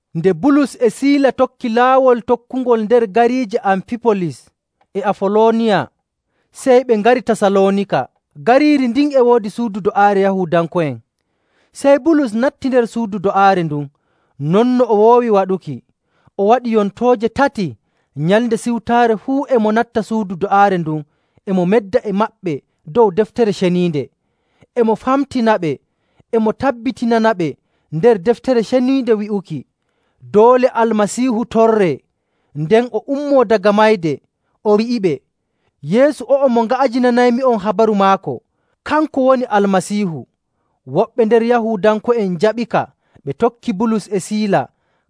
Nde Bulus e Siila tokki laawol tokkungol nder gariije Ampibolis e Afolooniya, sey ɓe ngari Tasaloonika. Gariiri ndin e woodi suudu do'aare Yahuudanko'en. Sey Bulus natti nder suudu do'aare ndun non no o woowi waɗuki. O waɗi yontooje tati Nyalnde Siwtaare fuu e mo natta suudu do'aare ndun e mo medda e maɓɓe dow Deftere Ceniinde. E mo famtinaɓe e mo tabbitinanaɓe nder Deftere Ceniinde wi'uki doole Almasiihu torree, nden o ummoo daga mayde. O wi'iɓe, “Yeesu o'o mo nga'ajinanaymi'on habaru maako, kanko woni Almasiihu.” Woɓɓe nder Yahuudanko'en njaɓika, ɓe tokki Bulus e Siila,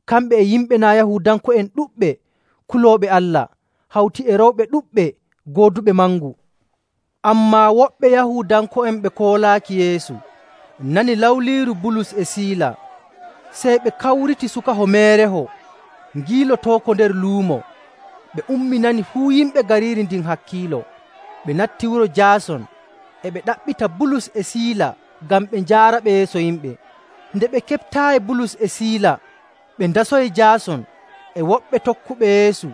kamɓe e yimɓe naa' Yahuudanko'en ɗuɗɓe kulooɓe Allah, hawti e rewɓe ɗuɗɓe gooduɓe mangu. Ammaa woɓɓe Yahuudanko'en ɓe koolaaki Yeesu nani lawliiru Bulus e Siila. Sey ɓe kawriti sukaho meereho, ngiilotooko nder luumo. Ɓe umminani fuu yimɓe gariiri ndin hakkiilo. Ɓe natti wuro Jaason, e ɓe ɗaɓɓita Bulus e Siila ngam ɓe njaaraɓe yeeso yimɓe. Nde ɓe keɓtaayi Bulus e Siila, ɓe ndasoyi Jaason e woɓɓe tokkuɓe Yeesu,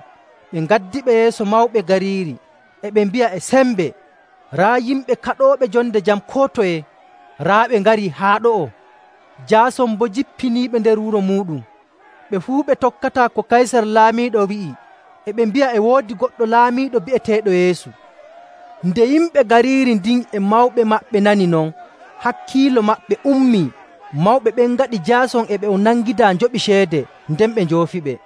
ɓe ngaddiɓe yeeso mawɓe gariiri, e ɓe mbi'a e sembe, “Raa yimɓe kaɗooɓe jonde jam koo toye, raa ɓe ngarii haa ɗo'o. Jaason boo jippiniiɓe nder wuro muuɗum! Ɓe fuu ɓe tokkataa ko Kaysar laamiiɗo wi'i, e ɓe mbi'a e woodi goɗɗo laamiiɗo bi'eteeɗo Yeesu.” Nde yimɓe gariiri ndin e mawɓe maɓɓe nani non, hakkiilo maɓɓe ummii. Mawɓe ɓen ngaɗi Jaason e ɓe o nangidaa njoɓi ceede, nden ɓe njoofiɓe.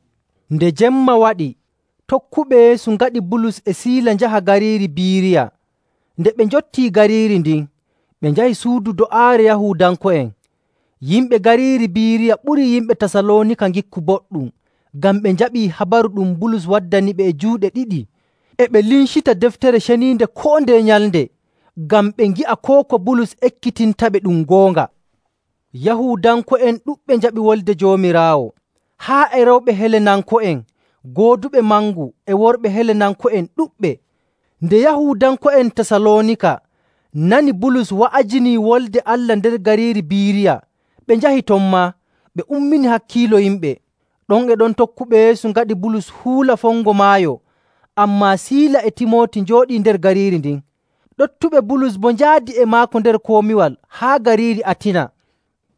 Nde jemma waɗi, tokkuɓe Yeesu ngaɗi Bulus e Siila njaha gariiri Biiriya. Nde ɓe njottii gariiri ndin, ɓe njahi suudu do'aare Yahuudanko'en. Yimɓe gariiri Biiriya ɓurii yimɓe Tasaloonika ngikku boɗɗum ngam ɓe njaɓii habaru ɗum Bulus waddaniɓe e juuɗe ɗiɗi. E ɓe lincita Deftere Ceniinde koo ndeye nyalnde, ngam ɓe ngi'a koo ko Bulus ekkitintaɓe ɗum goonga. Yahuudanko'en ɗuɗɓe njaɓi Wolde Joomiraawo, haa e rewɓe Helenanko'en gooduɓe mangu e worɓe Helenanko'en ɗuɗɓe. Nde Yahuudanko'en Tasaloonika nani Bulus wa'ajinii Wolde Allah nder gariiri Biiriya, ɓe njahi ton maa, ɓe ummini hakkiilo yimɓe. Ɗon e ɗon tokkuɓe Yeesu ngaɗi Bulus huula fongo maayo, ammaa Siila e Timooti njooɗii nder gariiri ndin. Ɗoftuɓe Bulus boo njaadi e maako nder komiwal haa gariiri Atina.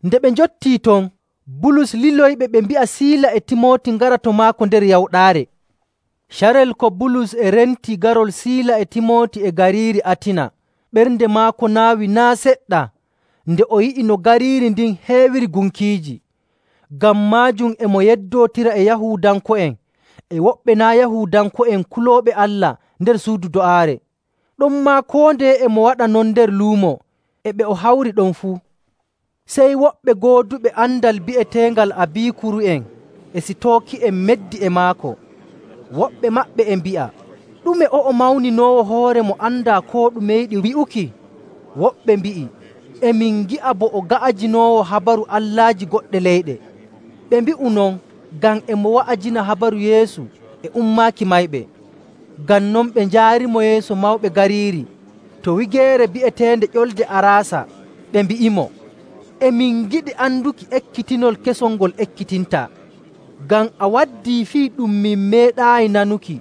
Nde ɓe njottii ton, Bulus liloyiɓe ɓe mbi'a Siila e Timooti ngara to maako nder yawɗaare. Carel ko Bulus e renti garol Siila e Timooti e gariiri Atina, ɓernde maako naawii naa' seɗɗa nde o yi'i no gariiri ndin heewiri gunkiiji. Ngam maajum e mo yeddootira e Yahuudanko'en e woɓɓe naa' Yahuudanko'en kulooɓe Allah nder suudu do'aare. Ɗonmaa koo ndeye e mo waɗa non nder luumo e ɓe o hawri ɗon fuu. Sey woɓɓe gooduɓe andal bi'eteeɓe Abikuuri'en e Sitooki'en meddi e maako. Woɓɓe maɓɓe e mbi'a, “Ɗume o'o mawninoowo hoore mo andaa koo ɗume yiɗi wi'uki?” Woɓɓe mbi'i, “E min ngi'a bo o ga'ajinoowo habaru allaaji goɗɗe leyɗe.” Ɓe mbi'u non ngam e mo wa'ajina habaru Yeesu e ummaaki mayɓe. Ngam non ɓe njaarimo yeeso mawɓe gariiri to wigeere bi'eteende Ƴolde Araasa, ɓe mbi'imo, “E min ngiɗi anduki ekkitinol kesol ngol ekkitintaa, ngam a waddii fii ɗum min meeɗaayi nanuki.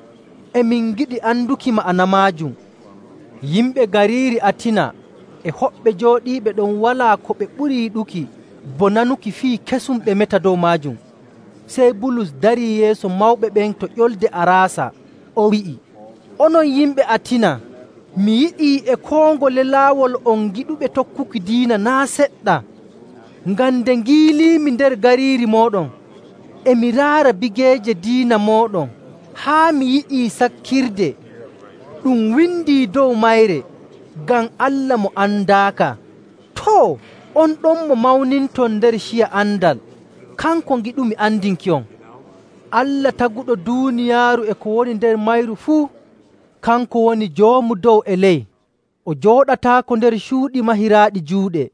E min ngiɗi anduki ma'ana maajum.” Yimɓe gariiri Atina e hoɓɓe jooɗiiɓe ɗon walaa ko ɓe ɓuri yiɗuki bo nanuki fii kesum ɓe meta dow maajum. Sey Bulus darii yeeso mawɓe ɓen to Ƴolde Araasa, o wi'i, “Onon yimɓe Atina, mi yi'ii e koo ngole laawol on giɗuɓe tokkuki diina naa' seɗɗa, ngam nde ngiiliimi nder gariiri mooɗon, e mi raara bigeeje diina mooɗon haa mi yi'i sakkirde, ɗum windi dow mayre ‘Ngam Allah mo andaaka.’ Too, on ɗon mo mawninton nder ciya andal, kanko ngiɗumi andinki'on. Allah Taguɗo duuniyaaru e ko woni nder mayru fuu, kanko woni Joomu dow e ley. O jooɗataako nder cuuɗi mahiraaɗi juuɗe.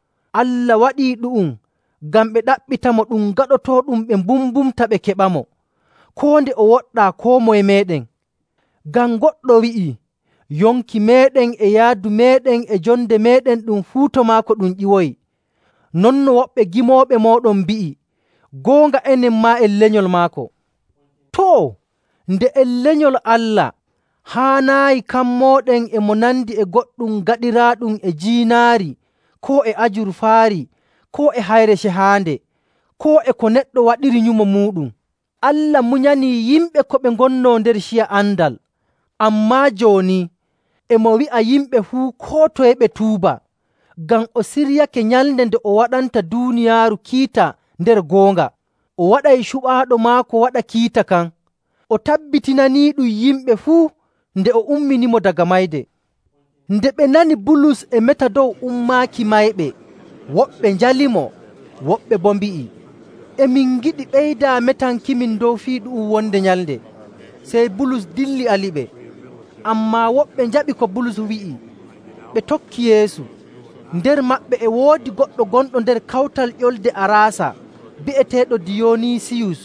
Allah waɗii ɗu'um ngam ɓe ɗaɓɓitamo ɗum gaɗotooɗum ɓe mbumbunta ɓe keɓamo, koo nde o woɗɗaa koo moye meeɗen.. Ngam goɗɗo wi'i, ‘Yonki meeɗen e yaadu meeɗen e jonde meeɗen ɗum fuu to maako ɗum ƴiwoyi.’. Non no woɓɓe gimooɓe mooɗon mbi'i, ‘Goonga enen maa, en lenyol maako.’ Too, nde en lenyol Allah, haanaayi kammooɗen e mo nandi e goɗɗum gaɗiraaɗum e jiinaari koo e ajurfaari koo e hayre cehaande, koo e ko neɗɗo waɗiri nyumo muuɗum. Allah munyanii yimɓe ko ɓe ngonnoo nder ciya andal. Ammaa jooni, e mo wi'a yimɓe fuu koo toye ɓe tuuba, ngam o siryake nyalnde nde o waɗanta duuniyaaru kiita nder goonga. O waɗay cuɓaaɗo maako waɗa kiita kan. O tabbitinaniiɗum yimɓe fuu nde o umminimo daga mayde.” Nde ɓe nani Bulus e meta dow ummaaki mayɓe, woɓɓe njalimo, woɓɓe boo mbi'i, “E min ngiɗi ɓeydaa metankimin dow fii ɗu'um wonde nyalnde.” Sey Bulus dilli aliɓe. Ammaa woɓɓe njaɓi ko Bulus wi'i ɓe tokki Yeesu. Nder maɓɓe e woodi goɗɗo gonɗo nder kawtal Ƴolde Araasa bi'eteeɗo Diyoniisiyus,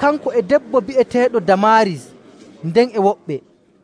kanko e debbo bi'eteeɗo Damaaris, nden e woɓɓe.